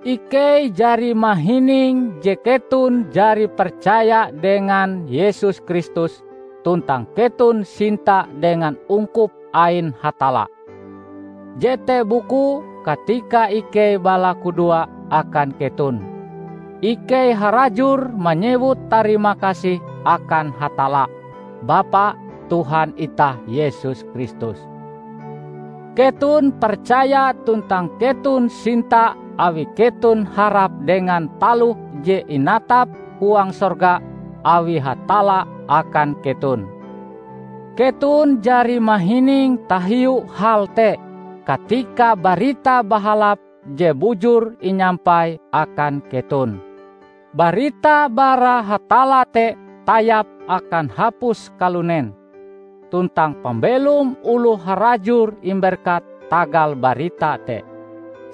Ikei jari mahining je keton jari percaya dengan Yesus Kristus tuntang keton sinta dengan ungkup ain Hatalla. Jete bukue katika ikei balakudoa akan keton, ikei harajur manyewut tarimakasih akan Hatalla, Bapa Tuhan itah Yesus Kristus. Keton percaya tuntang keton sinta awi keton harap dengan taloh je inatap huang sorga awi Hatalla akan keton. Keton jari mahining tahiu hal te, katika Barita Bahalap je bujur inyampai akan keton. Barita bara Hatalla te tayap akan hapus kalunen, tuntang pambelom oloh harajur imberkat tagal barita te,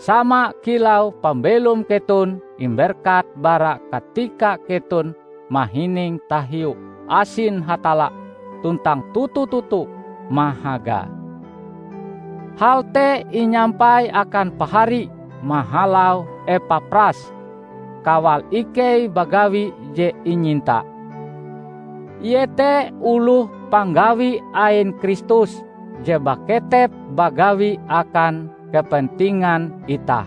sama kilau pambelom keton imberkat bara katika keton mahining tahiu asin Hatalla tuntang toto-toto mahagae. Hal te inyampai akan Pahari mahalau Epapras, kawal ikei bagawi je inyinta. Ie te oloh panggawi ain Kristus je baketep bagawi akan kepentingan itah.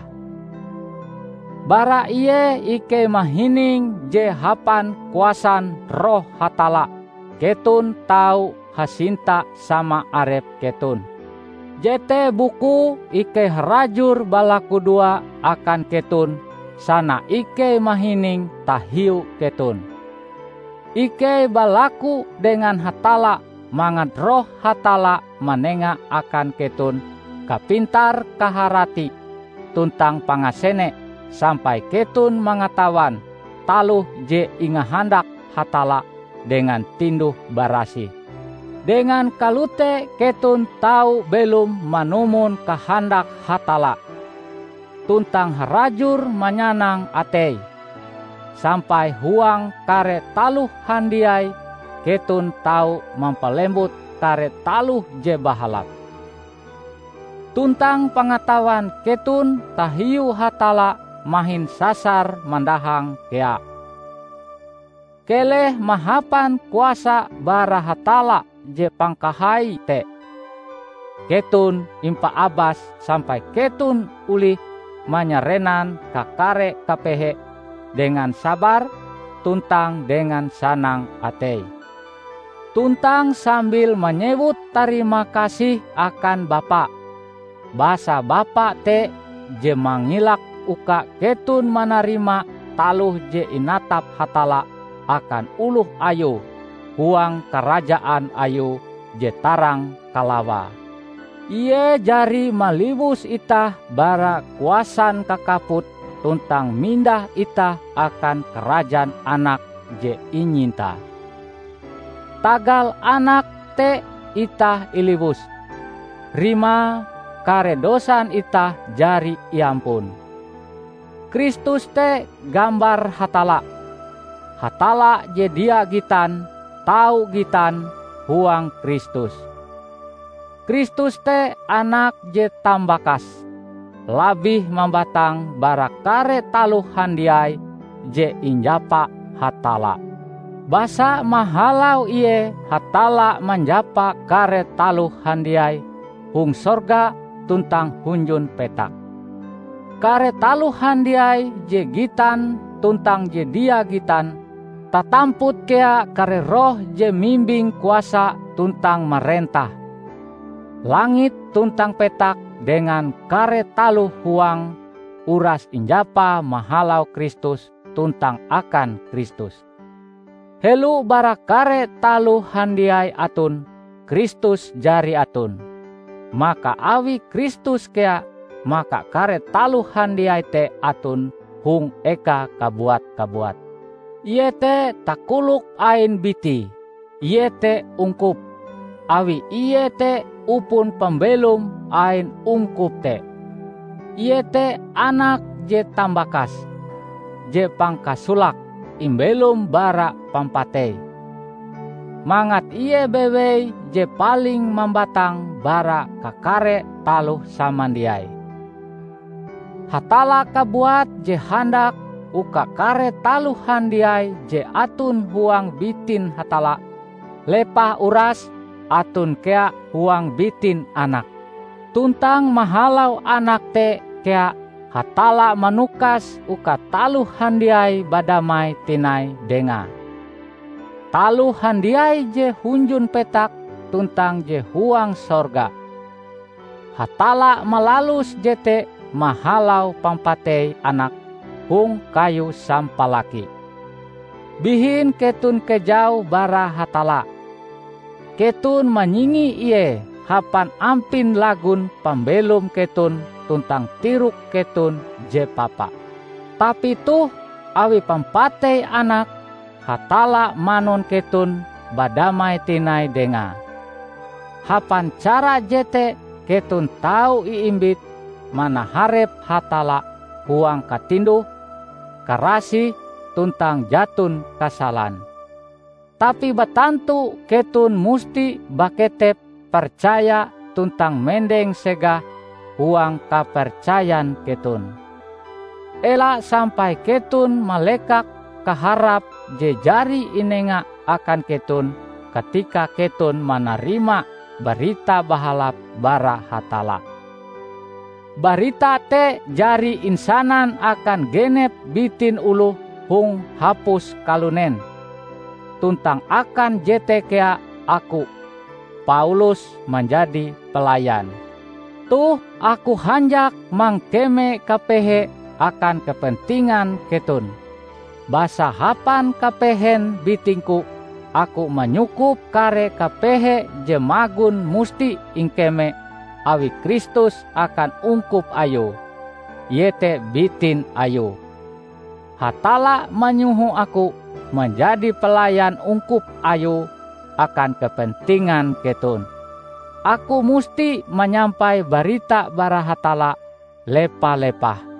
Bara ie ikei mahining je hapan kuasan Roh Hatalla keton tau hasinta sama arep keton. Jete bukue ikei harajur balakudoa akan keton sana ikei mahining tahiu keton. Ikei balaku dengan Hatalla mangat Roh Hatalla manenga akan keton kapintar-kaharati tuntang pangasene sampai keton mangatawan taloh je ingahandak Hatalla dengan tinduh-barasih. Dengan kalote keton tau belom manumon kahandak Hatalla, tuntang harajur manyanang ateie, sampai huang kare taloh handiai keton tau mampalembut kare taloh je bahalap. Tuntang pangatawan keton tahiu Hatalla mahin sasar mandahang kea. Keleh mahapan kuasa bara Hatalla je pangkahai te, keton impaabas sampai keton olih manyarenan kakare kapehe dengan sabar tuntang dengan sanang atei tuntang sambil manyewut tarimakasih akan Bapa. Basa Bapa te je mangilak uka keton manarima taloh je inatap Hatalla akan oloh Ayue huang karajaan Ayue je tarang kalawae. Ie jari maliwus itah bara kuasan kakaput tuntang mindah itah akan karajaan Anake je inyintae. Tagal Anake te itah iliwus; rimae, kare dosan itah jari iampun. Kristus te gambar Hatalla. Hatalla je dia gitan tau gitan huang Kristus. Kristus te Anak je tambakase, labih mambatang bara kare taloh handiai je injapa Hatalla. Basa mahalau Ie Hatalla manjapa kare taloh handiai hong sorga tuntang hunjun petak, kare taloh handiai je gitan tuntang je dia gitan, tatamput kea kare roh je mimbing kuasa tuntang marentah. Langit tuntang petak dengan kare taloh huange uras injapa mahalau Kristus tuntang akan Kristus. Helo bara kare taloh handiai aton, Kristus jari aton. Maka awi Kristus kea maka kare taloh handiai te aton hong ekae kabuat-kabuat. Ie te takolok ain Bitie, iete ungkup, awi Ie te upon pambelom ain ungkup te. Ie te Anak je tambakase, je pangkasolake imbelom bara pampatei, mangat Ie bewei je paling mambatang bara kakare taloh samandiai. Hatalla kabuat je handak uka kare taloh handiai je aton huang bitin Hatalla, lepah uras aton kea huang bitin Anake. Tuntang mahalau Anak te kea Hatalla manukas uka taloh handiai badamai tinai Dengae -- taloh handiai je hunjun petak tuntang je huang sorga. Hatalla malalus jete mahalau pampatei Anake hong kayu sampalaki. Bihin keton kejau bara Hatalla. Keton manyingi Ie hapan ampin lagon pambelom keton tuntang tirok keton je papa. Tapi toh, awi pampatei Anake, Hatalla manun keton badamai tinai Dengae. Hapan cara jete keton tau iimbit manaharep Hatalla huang katinduh, karasih, tuntang jaton kasalan. Tapi batantu keton musti baketep percaya tuntang mendeng segah huang kapercayan keton. Ela sampai keton malekak kaharap je jari inenga akan keton katika keton manarima Barita Bahalap bara Hatalla. Barita te jari insanan akan genep bitin oloh hong hapus kalunen. Tuntang akan jete kea aku, Paulus, manjadi pelayan. Toh aku hanjak mangkeme kapehe akan kepentingan keton. Basa hapan kapehen bitingku, aku manyukup kare kapehe je magon musti ingkeme awi Kristus akan ungkup Ayue, iete bitin Ayue. Hatalla manyoho aku manjadi pelayan ungkup Ayue akan kepentingan keton. Aku musti manyampai barita bara Hatalla, lepa-lepah;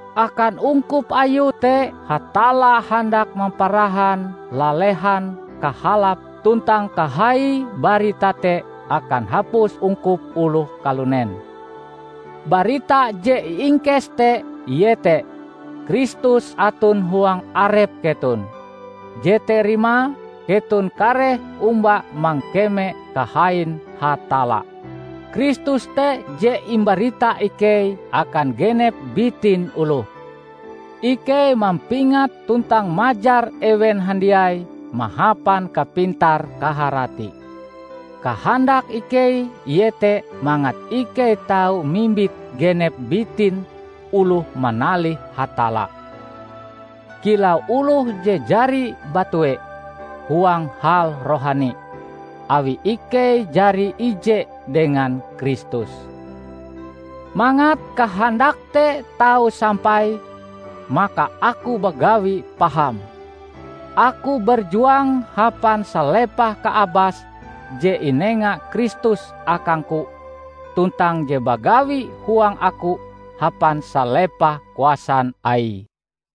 Akan ungkup Ayue te Hatalla handak mamparahan lalehan kahalap tuntang kahaie barita te akan hapus ungkup oloh kalunen. Barita je iingkes te iete: Kristus aton huang arep keton, jete rimae keton kareh omba mangkeme kahain Hatalla. Kristus te je imbarita ikei akan genep bitin oloh. Ikei mampingat tuntang majar ewen handiai mahapan kapintar-kaharati. Kahandak ikei iete mangat ikei tau mimbit genep bitin oloh manalih Hatalla, kilau oloh je jari batue huang hal rohani, awi ikei jari ije dengan Kristus. Mangat kahandak te tau sampai, maka aku bagawi paham. Aku berjuang hapan salepah kaabas je inenga Kristus akangku tuntang je bagawi huang aku hapan salepah kuasan Aie.